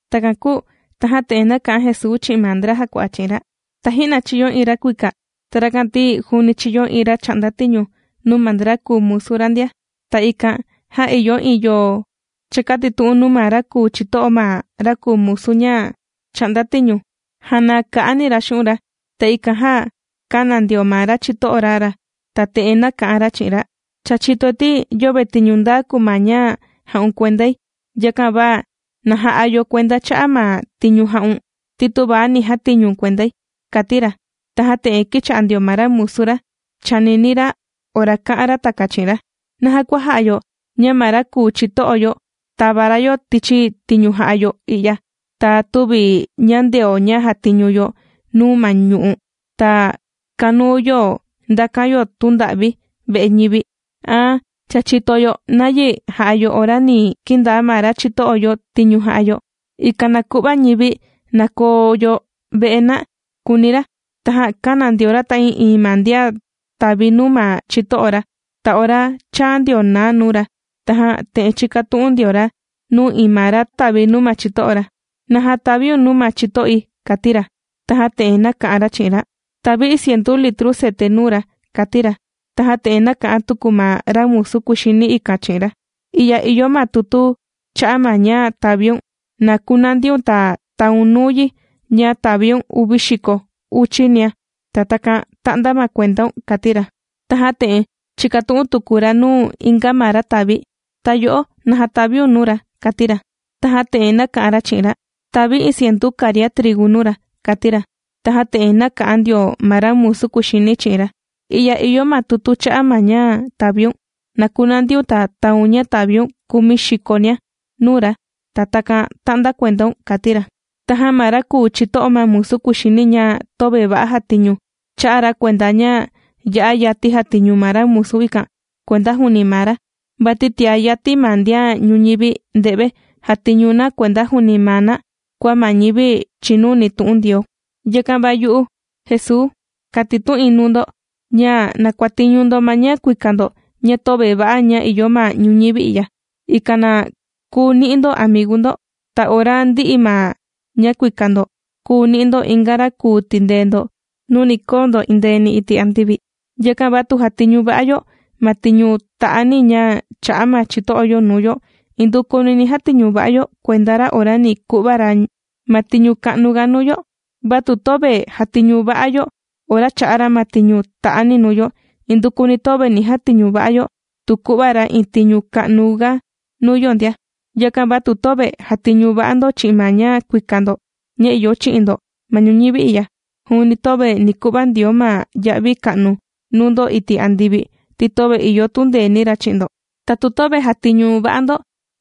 Takan kūu tajan te'en nāka'an Jesuu chi'in ma ndra jàkua'a chi'in ra: ―Taji'na chīyo iin ra kuika, ta rakan ti juuni chīyo iin ra chà'nda tiñu nuu ma ndra kùu musu ra ndia. Ta ikan jan ìyo iin yo chākatitu'un nuu ma ra kùu chito'o ma ra kùu musu ña chà'nda tiñu, janaa ka'ani ra xu'un' ra. Ta ikan jan kāna ndio ma ra chito'o ra ra ta te'en nāka'an ra chi'in ra: “Cha chìtoi ti yöve tiñu ndaa kùu ma ña jà'un kuendai. Yakan va na ja'a yo kuenda cha'a' ma tiñu jā'un ti tüva ni jatiñu̱n kuendai”, kàti ra. Tajan te'en kīcha'a ndio ma ra musu ra chànini ra ora kā'an ra takan chi'in ra: “¿Naja kua ja'a yo ña ma ra kùu chito'o yo tāva ra yo tichi tiñu jà'a yo i'ya, ta tüvi ñàndeo ña jàtiñu yo nuu ma ñu'u', ta kànuu yo ndakan yo tunda'vi ve'e ñivi? Aan, cha chìto yo nayi ni ja'a yo ora ni kindaa ma ra chito'o yo tiñu jà'a yo, ikan na ku'va ñivi na koo yo ve'e na”, kùuni ra. Tajan kāna ndio ra ta'ii'iin ma ndian tàvi nuu ma chito'o ra. Ta ora chāa ndio na nuu ra, tajan te'en chīkatu'un ndio ra nuu iin ma ra tàvi nuu ma chito'o ra: “¿Naja tàviun nuu ma chito'i?”, kàti ra. Tajan te'en nāka'an ra chi'in ra: “Tàvi̱ iin cientu litru cete nuu ra”, kàti ra. Tajan te'en nāka'an tuku ma ra musu kuxini ikan chi'in ra: “I'ya ìyo ma tutu cha'a' ma ña tàviun, na kunandiun ta taun nuu yi ña tàviun uvi xiko uchi nia. Ta takan ta'nda ma kuendaun”, kàti ra. Tajan te'en chīkatu'un tuku ra nuu inga ma ra tàvi: “¿Ta yo'o, naja tàviun nuu ra?”, kàti ra. Tajan te'en nāka'an ra chi'in ra: “Tàvi̱ iin cientu karia trigu nuu ra”, kàti ra. Tajan te'en nāka'an ndio ma ra musu kuxini chi'in ra: “I'ya ìyo ma tutu cha'a' ma ña tàviun. Na kunandiun ta taun ña tàviun kumi xikonia nuu ra, ta takan ta'nda kuendaun”, kàti ra. Tajan ma ra kùu chito'o ma musu kuxini ña töve va'a jàtiñu, chā'a ra kuenda ña ya'a yati jàtiñu ma ra musu ikan kuenda juuni maa ra, vati tiá yati ma ndian ñuñivi nde've jàtiñu na kuenda juuni maa na kua ma ñivi chìnuni tu'un Ndioo. ’Yakan va yu'u Jesuu, kàtitu'in nuu ndo ña na kuàtiñu ndo ma ña kuika ndo ña töve va'a ña ìyo ma ñuñivi i'ya, ikan na kùu ni'i ndo amigu ndo. Ta ora ndi'i ma ña kuika ndo kuu ni'i ndo inga ra kùu tindee ndo nuu ni koo ndo endeeni iti' andivi. Yakan va tu jàtiñu va'a yo ma tiñu ta'ani ña chà'a ma chito'o yo nuu yo indukuni ni jatiñu va'a yo kuenda ra ora ni ku'va ra ma tiñu ka'nuga nuu yo. Va tu töve jàtiñu va'a yo ora chà'a ra ma tiñu ta'ani nuu yo, indukuni töve ni jatiñu va'a yo tu ku'va ra iin tiñu ka'nuga nuu yo ndia. Yakan va tu töve jàtiñu va'a ndo chi'in ma ña kuika ndo ña ìyo chi'in ndo ma ñuñivi i'ya, juuni töve ni ku'va Ndioo ma ya'vi ka'nu nuu ndo iti' andivi, ti töve ìyo tundeeni ra chi'in ndo. Ta tu töve jàtiñu va'a ndo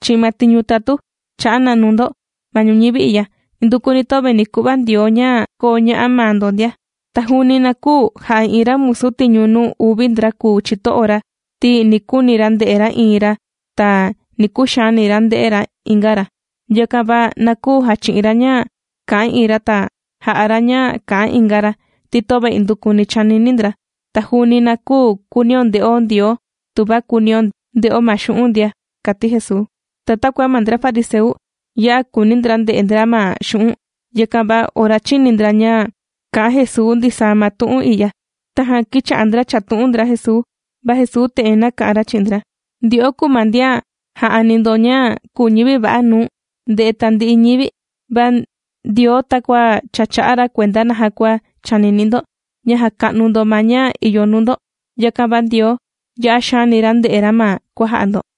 chi'in ma tiñu tatu chā'a na nuu ndo ma ñuñivi i'ya, indukuni töve ni ku'va Ndioo ña koo ña'a maa ndo ndia. ’Ta juuni na küu ja'a iin ra musu tiñu nuu uvi ndra kùu chito'o ra, ti ni kuuni ra nde'e ra iin ra ta ni kuxaani ra nde'e ra inga ra. Yakan va na küu jachi'in ra ña kà'an iin ra ta ja'a ra ña kà'an inga ra, ti töve indukuni chànini ndra. Ta juuni na küu kuunio nde'o Ndioo tuva kùunio nde'o ma xu'un' ndia ―kàti Jesuu. Ta takua ma ndra fariseu ya'a kùuni ndra nde'e ndra ma xu'un', yakan va ora chīni ndra ña kā'an Jesuu ndisaa ma tu'un i'ya, tajan kīcha'a ndra chàtu'un ndra Jesuu. Va Jesuu te'en nāka'an ra chi'in ndra: ―Ndyo'o kùu ma ndian jà'ani ndo ña kùu ñivi va'a nuu nde'e tandi'i ñivi, va Ndioo takua cha chà'a ra kuenda naja kua chànini ndo, ña jàka'nu ndo ma ña ìyo nuu ndo, yakan va Ndioo ya'a xaani ra ndè'e ra ma kuàja'a ndo.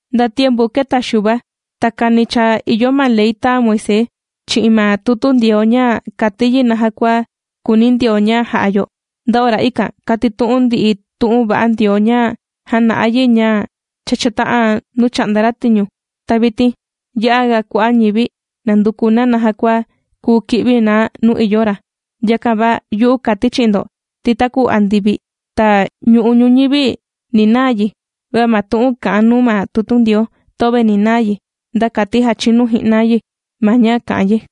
’Nda tiempu kēta Xuva takani cha ìyo ma Ley tāa Moisés chi'in ma tutu Ndioo ña kàti yi naja kua kùuni Ndioo ña jà'a yo. Nda ora ikan, kàtitu'un ndi tu'un va'a Ndioo ña jàna'a yi ña cha chāta'an nuu chà'nda ra tiñu. Ta vitin ya'a ga kua'a' ñivi nànduku na naja kua kuu ki'vi na nuu ìyo ra. Yakan va yu'u kàti chi'in ndo ti taku andivi ta ñu'u' ñuñivi ni naa yi, va ma tu'un kà'an nuu ma tutu Ndioo töve ni naa yi, nda kati jachinu ji'na yi ma ña kà'an yi.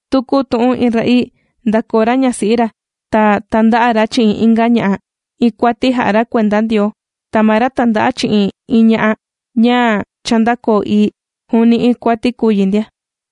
’Taku tu iin ra'ii ndàkoo ra ñasi'i ra ta tànda'a ra chi'in inga ña'a, iin kuati jà'a ra kuenda Ndioo. Ta ma ra tànda'a chi'in iin ña'a ña cha ndākoo ii, juuni iin kuati kùu yi ndia.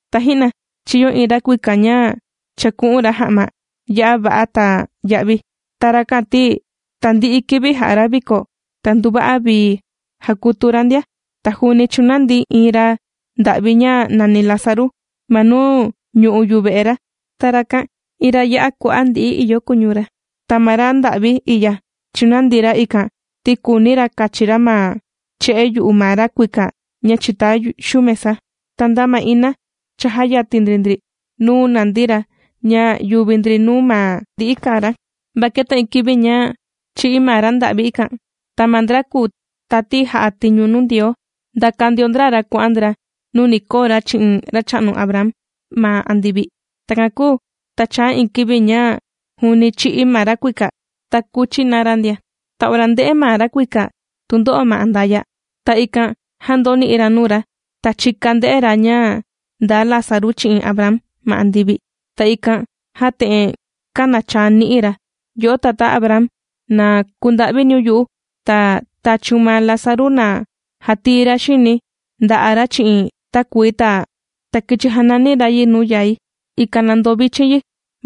’Taji'na chīyo iin ra kuika ña chāku'un ra ja'ma ya'a va'a ta ya'vi. Ta rakan ti tandi'i kivi jà'a ra viko ta nduva'a vii jàkutu ra ndia. Ta juuni chūnandi iin ra nda'vi ña nàni Lázaru ma nuu ñu'u' yuve'e ra. Ta rakan iin ra ya'a kua'a' ndi'i lakua ìyo kuñu ra. Ta ma ra ndà'vi i'ya chùnandi ra ikan ti kùuni ra kachi ra ma che'e yu'u ma ra kuika ña chìta xuu mesa. Ta nda ma ina cha jàyatin ndri ndri nuu nàndi ra ña yùvi ndri nuu ma ndi'i kàa ra. Va kēta iin kivi ña chī'í ma ra nda'vi ikan. Ta ma ndra kùu tati jà'a tiñu nuu Ndioo ndàka ndio ndra ra kuà'an ndra nuu ni koo ra chi'in racha'nu Abraham ma andivi. Takan kūu ta chāa iin kivi ña juuni chī'í ma ra kuika, ta kūchi na ra ndia. ’Ta ora ndè'e ndio ma ra kuika tundo'o ma andaya', ta ikan jan ndōni'i ra nuu ra ta chika ndē'e ra ña ndaa Lázaru chi'in Abraham ma andivi. Ta ikan jan te'en kānachaa ni'i ra: “Yo'o tatá Abraham, na kunda'viniun yu'u, ta tachiun ma Lázaru na jatii ra xini nda'a' ra chi'in takuii ta kichi janani ra yi nuu yai, ikan na ndovichin yi,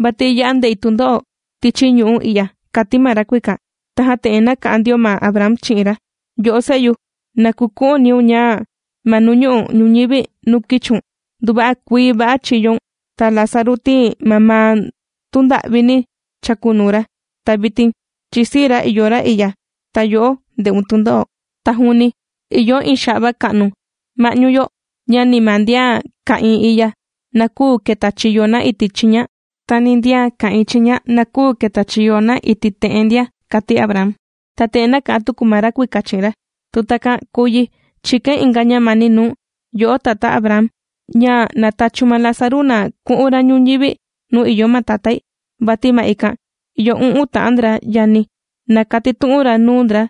vati ya'a ndè'i tundo'o tichi ñu'ú i'ya”, kàti ma ra kuika. Tajan te'en nāka'an ndio ma Abraham chi'in ra: “Yo'o se'yu, na kuku'uniun ña ma nuu ñu'u' ñuñivi nuu kīchiun, nduva'a kuii va'a chīyoun, ta Lázaru ti mamaa tunda'vini chākunuu ra. Ta vitin chìsii ra ìyo ra i'ya, ta yo'o ndè'un tundo'o. Ta juuni ìyo iin xa'va ka'nu ma'ñu yo, ña ni ma ndian ka'ìin i'ya na küu keta chiyo na iti' chiña, ta ni ndian ka'ìin chiña na küu keta chiyo na iti' te'en ndia”, kàti Abraham. ’Tajan te'en nāka'an tuku ma ra kuika chi'in ra: “Tu takan kùu yi chìkain inga ñamani nuu̱n, yo'o tatá Abraham, ña na tachiun ma Lázaru na ku'un ra ñuñivi nuu ìyo ma tatái, vati ma ikan ìyo u'un ta'an ndra yani̱, na katitu'un ra nuu ndra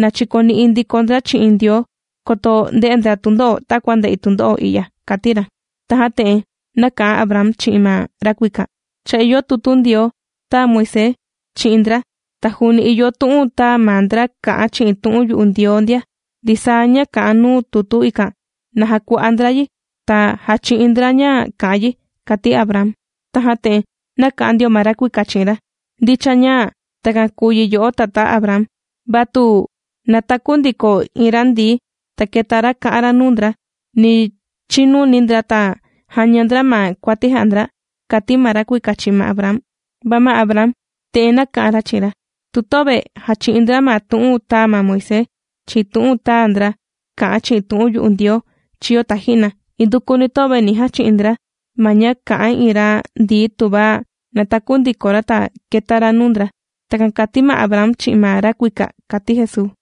na chikoni'i ndiko ndra chi'in Ndioo, koto nde'e ndra tundo'o takua ndè'i tundo'o i'ya”, kàti ra. Tajan te'en nāka'an Abraham chi'in ma ra kuika: “Cha ìyo tutu Ndioo tāa Moisés chi'in ndra ta juuni ìyo tu'un tāa ma ndra kà'an chi'in tu'un yu'u Ndioo ndia, ndisaa ña kà'an nuu tutu ikan, na jakua'a ndra yi ta jachi'in ndra ña kà'an yi”, kàti Abraham. Tajan te'en nāka'an ndio ma ra kuika chi'in ra: “Ndicha ña takan kùu yi yo'o tatá Abraham, va tu nataku ndiko iin ra ndií, ta keta ra ka'an ra nuu ndra, ni chinuni ndra ta jaña ndra ma kuati jà'a ndra”, kàti ma ra kuika chi'in ma Abraham. Va ma Abraham te'en nāka'an ra chi'in ra: “Tu töve jàchi'in ndra ma tu'un tāa ma Moisés chi'in tu'un tāa ndra kā'an chi'in tu'un yu'u Ndioo chīyo taji'na, indukuni töve ni jachi'in ndra ma ña kà'an iin ra ndií tuva nataku ndiko ra ta keta ra nuu ndra.” Takan kàti ma Abraham chi'in ma ra kuika ―kàti Jesuu.